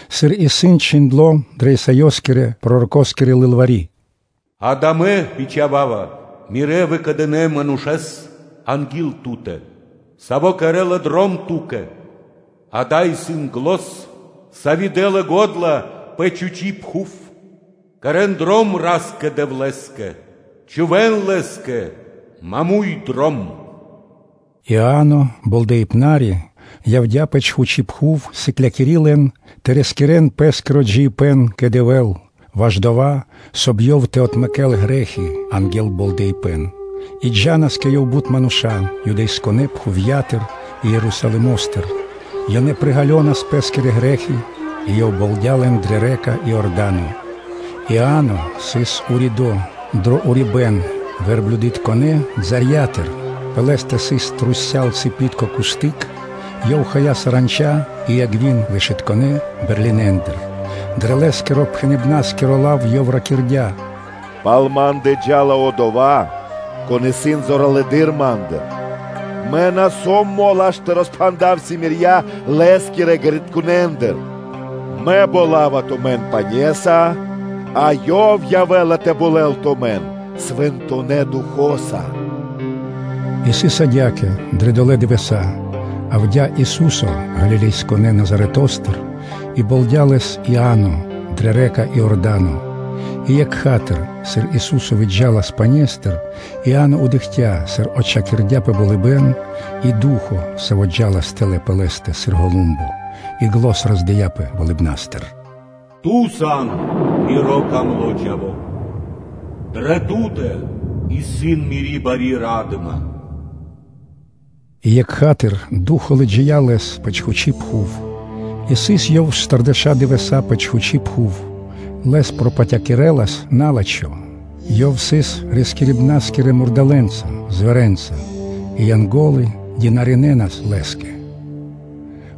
Сыр исын чхиндло́ дрэ Исаёскирэ-пророкоскири лылвари́: “Акэ, Мэ бичхава́ва Мирэ́ выкэдынэ́ манушэ́с анги́л Ту́тэ, саво́ кэрэ́ла дром Ту́кэ: Акэ, исын зан, сави́ дэ́ла го́дла пэ чхучи́ (пусто) пхув: ‘Кэрэ́н дром Ра́скэ-Дэвлэ́скэ, чхувэ́н Лэ́скэ маму́й (роўно) дром.’” Иа́но Болдэипнари явдя́ пэ чхучи́ пхув, сыклякири лэн тэ рискирэ́н пэ́скиро джиибэ́н кэ Дэвэ́л ваш дова́, соб (кай) Ёв тэ отмэкэ́л грэ́хи анги́л болдэипэн. И джа́нас кэ ёв бут мануша́ Юдэя́кирэ пхувья́тыр и Ерусалимо́стыр, ёнэ приґалёнас пэ́скирэ грэ́хи, и ёв болдя лэн дрэ рэка (лэнь) Иорда́но. Иа́но сыс уридо́ дро урибэ́н верблюдытконэ балэндыр, пэ лэ́стэ сыс трусця́л (вокруг) трушу́л цыпитко кусты́к, ёв хая саранча и авги́н (мэда) вэшытконэ бэрлинендыр (пчолэндыр). Дрэ лэ́скирэ-пхэныбнаскиро лав ёв ракирдя́: “Пал ма́ндэ джа́ла Одова́, Кон исын зоралэды́р ма́ндыр, мэ на сом мол аж тэ роспхандав симирья Лэ́скирэ ґэритконэндыр. Мэ болава тумэн пане́са, а Ёв явэ́ла тэ болэл тумэн Свэнтонэ́ Духо́са.” И сыс адя́кэ дрэ долэ́ дывэса́: явдя́ Ису́со Галилеякирэ Назаретостыр, и болдя Лэс Иа́но дрэ рэка (лэнь) Иорда́но. И екха́тыр (сра́зу), сыр Ису́со выджа́лас пане́стыр, Иа́но дыкхця́, сыр отчхакирдяпэ болыбэ́н, и Ду́хо (Фа́но), саво́ джа́лас тэлэ́ пэ Лэ́стэ сыр голумбо; и зан роздыяпэ болыбна́стыр: “Ту сан Миро дро́го Чхаво́! Дрэ Ту́тэ исын Мири́ бари ра́дыма!” И екха́тыр Ду́хо (Фа́но) лыджия́ Лэс пэ чхучи́ пхув. И сыс Ёв штардэша́ дывэса́ пэ чхучи́ пхув, Лэс пропатякирэлас на́лачхо; Ёв сыс рискирибна́скирэ мурдалэ́нца (зверенца) и Янго́лы дынаринэ́нас (служынэ́нас) Лэ́скэ.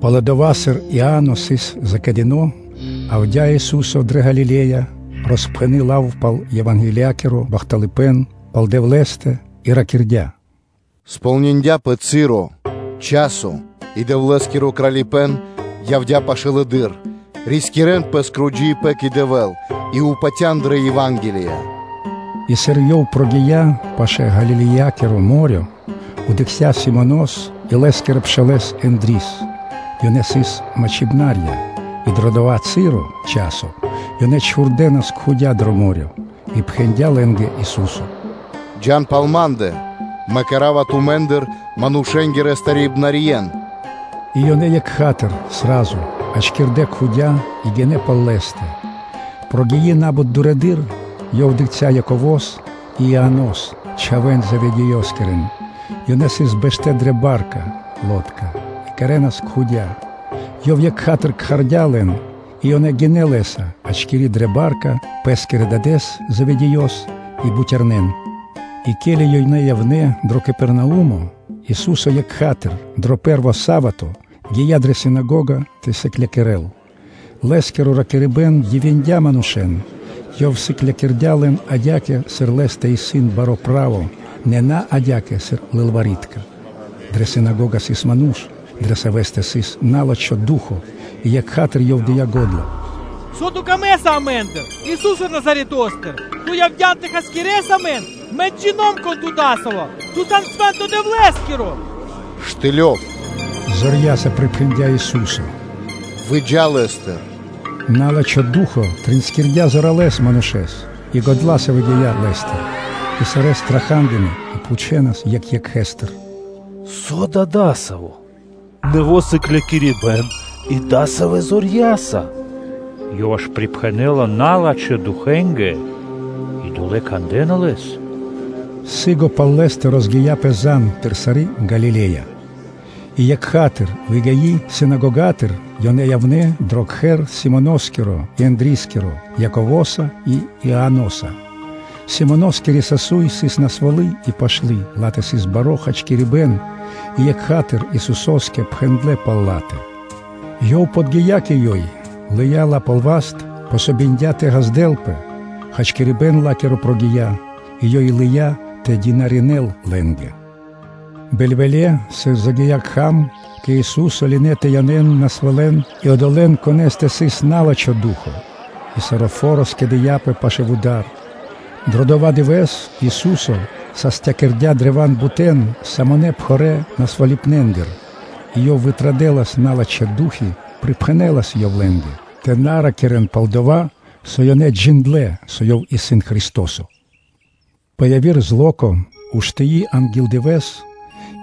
Пало́ дова́, сыр Иа́но сыс закэдыно, явдя́ Ису́со дрэ Галиле́я, роспхэни лав пал Евангелиякиро бахталыпэ́н пал Дэвлэ́стэ, и ракирдя́: “Подги́я часо (цы́ро) и Дэвлэ́скиро Кралипэ́н явдя́ пашылэды́р; рискирэ́н пэ́скиро джиибэ́н кэ Дэвэ́л и патя́н дрэ Ева́нгелия.” И сыр Ёв гия́ пашы́л Галилеякиро мо́рё (дэрья́в), дыкхця́ Симонос и лэ́скирэ пшалэ́с Ендрис; ёнэ сыс мачхарья (мачхибнарья) и дро дава́ часо ёнэ чхурдэнас кхудя (сети) дро мо́рё (дэрья́в). И пхэндя́ лэ́нгэ Ису́со: “Джа́н пал Ма́ндэ, Мэ кэра́ва тумэ́ндыр манушэ́нгирэ старибнарьен.” И ёнэ екха́тыр (сра́зу) ячкирдэ́ кхудя и гинэ́ пал Лэ́стэ. Прогии на́бут дурэды́р, Ёв дыкхця́ Яково́с и Ианос, чхавэ́н Зеведеёскирэн, ёнэ сыс бэштэ́ дрэ ба́рка (лодка) и кэрэ́нас кхудя; Ёв екха́тыр кхардя́ лэн; и ёнэ гинэ́ Лэ́са, ячкири дрэ ба́рка пэ́скирэ Дадэ́с Заведеёс и бутярнэн. И ке́ли ёнэ явнэ́ дро Капернаумо, Ису́со екха́тыр (сра́зу), дро пэ́рво са́вато (субо́та), гия́ дрэ синагога тэ сыклякирэ́л. Лэ́скиро ракирибэ́н дивиндя манушэ́н, Ёв сыклякирдя́ лэн адя́кэ, сыр Лэ́стэ сыс баро́ право, нэ на адя́кэ, сыр лылвари́тка (кни́жники). Дрэ синагога сыс ману́ш, дрэ савэ́стэ сыс на́лачхо ду́хо (фа́но), и екха́тыр (сра́зу) ёв дыя́ го́дла: “Со Ту́кэ трэй амэ́ндыр, Ису́се Назаретостыр? Ту явдя́н тэ хасякирэс амэн? Мэ джино́м (джина́в), кон Ту адасаво́ сан, Ту сан Свэ́нто Дэвлэ́скиро!” “Штылёв, – зорья́са припхэндя́ Ису́со, – “выджа лэ́стыр!” На́лачхо ду́хо (фа́но) тринскирдя зоралэ́с манушэ́с и годла́са выгия́ лэ́стыр. И сарэ́ страха́дынэ и пхучэнас екх екхэстыр: “Со да дасаво исын? Нэво́ сыклякирибэ́н и дасавэ́ зорья́са! Ёв аж припхэнэла налачхэ́ духэнгэ (фанэнгэ) и долэ́ кандэ́на Лэс!” Сы́гэс пал Лэ́стэ розгия́пэ зан (звесь) пир сари́ Галиле́я. И екха́тыр (сра́зу), выгии синагогатыр, ёнэ явнэ́ дро кхэр Симоноскиро и Ендрискиро, Яковоса и Ианоса. Симоноскири сасуй сыс насвалы и пашты, ла́тэ сыс баро́ хачкирибэ́н, и екха́тыр Исусо́скэ пхэндлэ́ пал ла́тэ. Ёв подги́я кэ ёй, лыя́ ла пал васт, помогиндя тэ ґаздэлпэ; хачкирибэ́н ла́киро прогия́, и ёй лыя́ тэ дынаринэ́л лэ́нгэ. Бэльвэле́, сыр загия́ кхам, кэ Ису́со лынэ́ тэ янэ́н насвалэн и одолэ́н, конэ́стэ сыс на́лачхо ду́хо (фа́но); и саро́ фо́ро скэдыяпэ пашы́л вуда́р. Дро дова́ дывэ́с Ису́со састякирдя древа́н бут самонэ пхарэ́ насвалыпнэндыр и Ёв традэлас яври налачхэ́ ду́хи, и припхэнэлас Ёв лэ́нгэ тэ на ракирэ́н, пал-дова́ со ёнэ джиндлэ́, со Ёв сыс Христо́со. Пэ яви́р зло́ко (ра́нко), уштыи анги́л дывэ́с,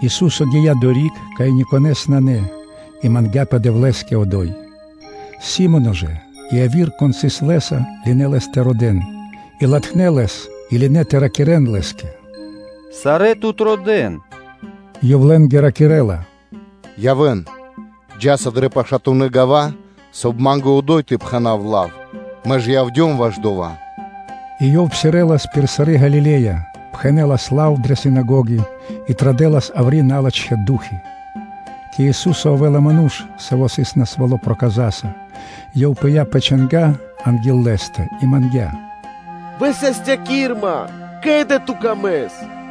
Ису́со гия́ одори́к, кай никонэ́с нанэ, и мангдя́пэ Дэвлэ́скэ одо́й. Си́моно жэ и яви́р, кон сыс Лэ́са, лынэ́ Лэс тэ родэ́н, И латхнэ́ Лэс и лынэ́ тэ ракирэ́н Лэ́скэ: “Сарэ́ Тут родэ́на!” Ёв лэ́нгэ ракирэ́ла: “Явэ́н, джа́са дрэ пашатунэ́ гава́, соб (кай) Ма́нгэ и одо́й тэ пхэна́в лав. Мэ ж и явдём ваш дова́.” И Ёв пхэнэлас лав пал Дэвлэ́стэ дрэ синагоги пир сари́ Галиле́я, и традэлас яври́ налачхэ́ ду́хи (фаны). Кэ Ису́со явэ́ла ману́ш, саво́ сыс насвало́ проказаса: ёв пыя́ пэ чанга́ анги́л Лэ́стэ, и мангдя́: “Высастякир Ман, ко́ли Ту́кэ исын пир ило́.”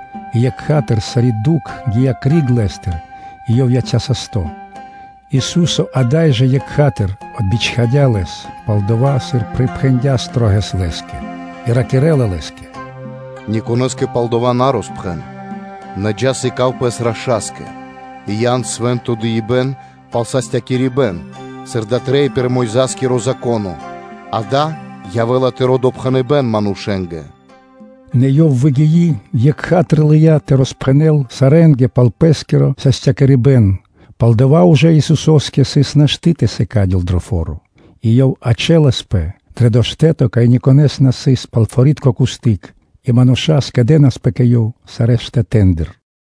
И екха́тыр, сари́ дукх гия́ криг лэ́стыр и ёв яця́ састо́. Ису́со ада́й жэ екха́тыр (сра́зу) отбичхадя лэс, пало́ дова́, сыр припхэндя́ шылалэс Лэ́скэ, и ракирэ́ла Лэ́скэ: “Никонэ́скэ пал дава́ на роспхэн; нэ джа́; сыка́в пэс раша́скэ, и ян свэ́нто дыибэ́н пал састякирибэн, сыр дава́ трэй пир Мойза́скиро Зако́но, дава́ явэ́ла тыро́ допхэныбэ́н манушэ́нгэ.” Нэ ёв, выгии, екха́тыр лыя́ тэ роспхэнэл сарэ́нгэ пал пэ́скиро састякирибэн, пал-дова́ ужэ Исусо́скэ сыс нашты́ тэ сыкадёл дро фо́ро, и Ёв ячэласпэ пэ дова́ штэ́то, кай никонэ́с на сыс пал форитко кусты́к (граница), и мануша́ скэдэнаспэ кэ Ёв сарэ́ штэтэ́ндыр.